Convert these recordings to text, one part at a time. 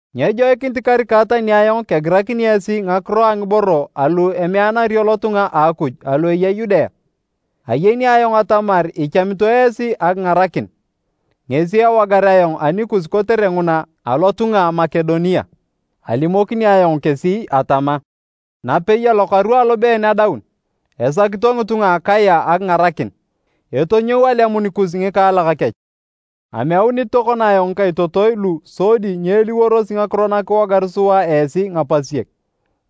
Nyejoikinit karika tani ayong kegirakini esi ngakiro a ngiboro alu emeanario lotunga a Akuj alu eya Yudea. Ayeni ayong atamar ichamito esi akingarakin, ngesi ewogar ayong anikus kotere nguna alotunga a Makedonia. Alimokini ayong kesi atama, “Napei alokaru alobeen adaun, esakito ngitunga a Akaya akingarakin.” Etonyou alemun kus ngikaalak kech. Ameunit tokona ayong ngikaitotoi lu sodi nyeeliworosi ngakiro na kiwogar sua esi ngapasiek.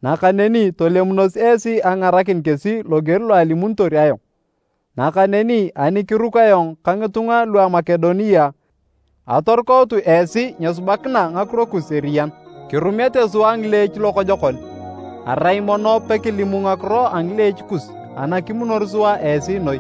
Nakaneni tolemunos esi akingarakin kesi loger lo alimunitor ayong. Nakaneni, ani kiruku ayong ka ngitunga lua Makedonia atorukautu esi nyesubakina ngakiro kus eriyan, kirumete sua ngileech lokojokon, arai mono pekilimu ngakiro a ngileech kus, ana kimunor sua esi noi!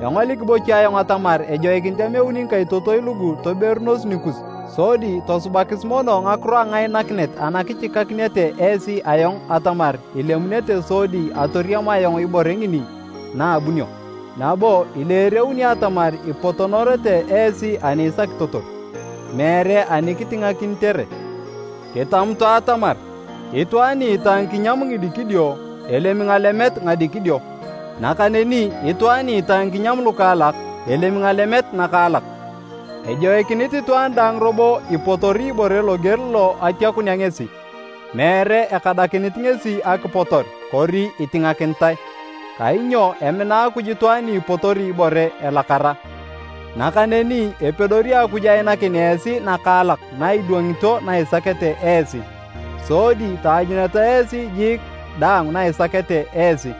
Engolik bocha ayong atamar ejoikinit ameuni ngikaitotoi lugu toberunos nikus sodi tosubakis mono ngakiro a ngainakinet ana kichikakinete esi ayong atamar ilemunete sodi atoriam ayong ibore ngini na abunio, nabo ileereuni atamar ipotonorete esi ani isakitotor, meere ani kitingakinitere. Kitamutu atamar itwaan ni itae ngikinyam ngidikidio, elemi ngalemet ngadikidio, nakaneni itwaan ni itae ngikinyam lukaalak, elemi ngalemet nakaalak. Ejoikinit itwaan daang robo ipotori ibore loger lo atiakunea ngesi, meere ekadakinit ngesi akipotor kori itingakinitae, kainyo emina Akuj itwaan ni ipotori ibore elakara. Nakaneni epedori Akuj ainakin esi nakaalak na idwangito na isakete esi. Sodi taanyununeta esi jiik daang na isakete esi,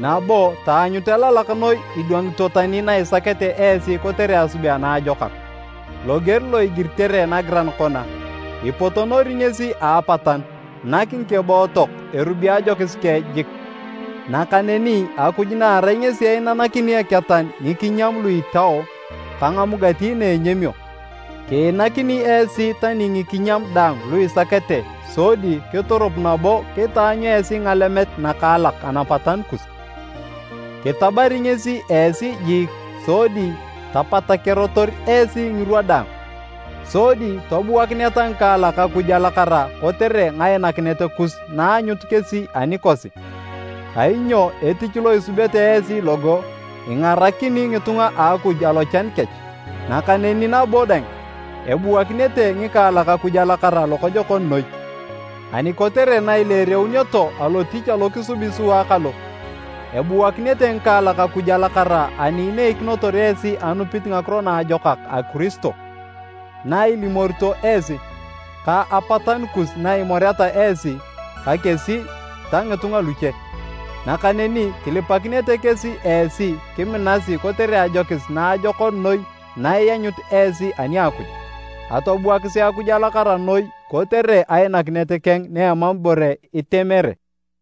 nabo taanyut elalak noi idwangito tani na isakete esi kotere asubea naajokak. Loger lo igiritere nagiran kona, “Ipotonori ngesi a apataanu, nak ngikebootok erubi ajokis keng jik.” Nakaneni Akuj na erai ngesi inanakini eketan ngikinyam lu itao ka ngamugati na enyamio, kiinakini esi tani ngikinyam daang lu isakete sodi kiturup nabo kitaanyu esi ngalemet nakaalak anapatanu kus. Kitabari ngesi esi jiik sodi tapatakerator esi ngirwa daang, sodi tobuakineta ngikaalak Akuj alakara kotere ngainakinet kus naanyut kesi anikosi. Kainyo etich lo isubete esi logo, ingarakini ngitunga a Akuj alochan kech. Nakaneni nabo dang, ebuakinete ngikaalak Akuj alakara lokojokon noi. Ani kotere na ileereunioto alotich alo kisubi sua kalo, ebuakinete ngikaalak Akuj alakara ani ineikinotor esi anupit ngakiro naajokak a Kiristo, na ilimorito esi, ka apatanu kus na imoreta esi ka kesi ta ngitunga luche. Nakaneni kilipakinete kesi esi kiminasi kotere ajokis naajokon noi na ianyut esi ani a Akuj. Atobuakisi Akuj alakara noi kotere ainakinet keng na emam ibore itemere!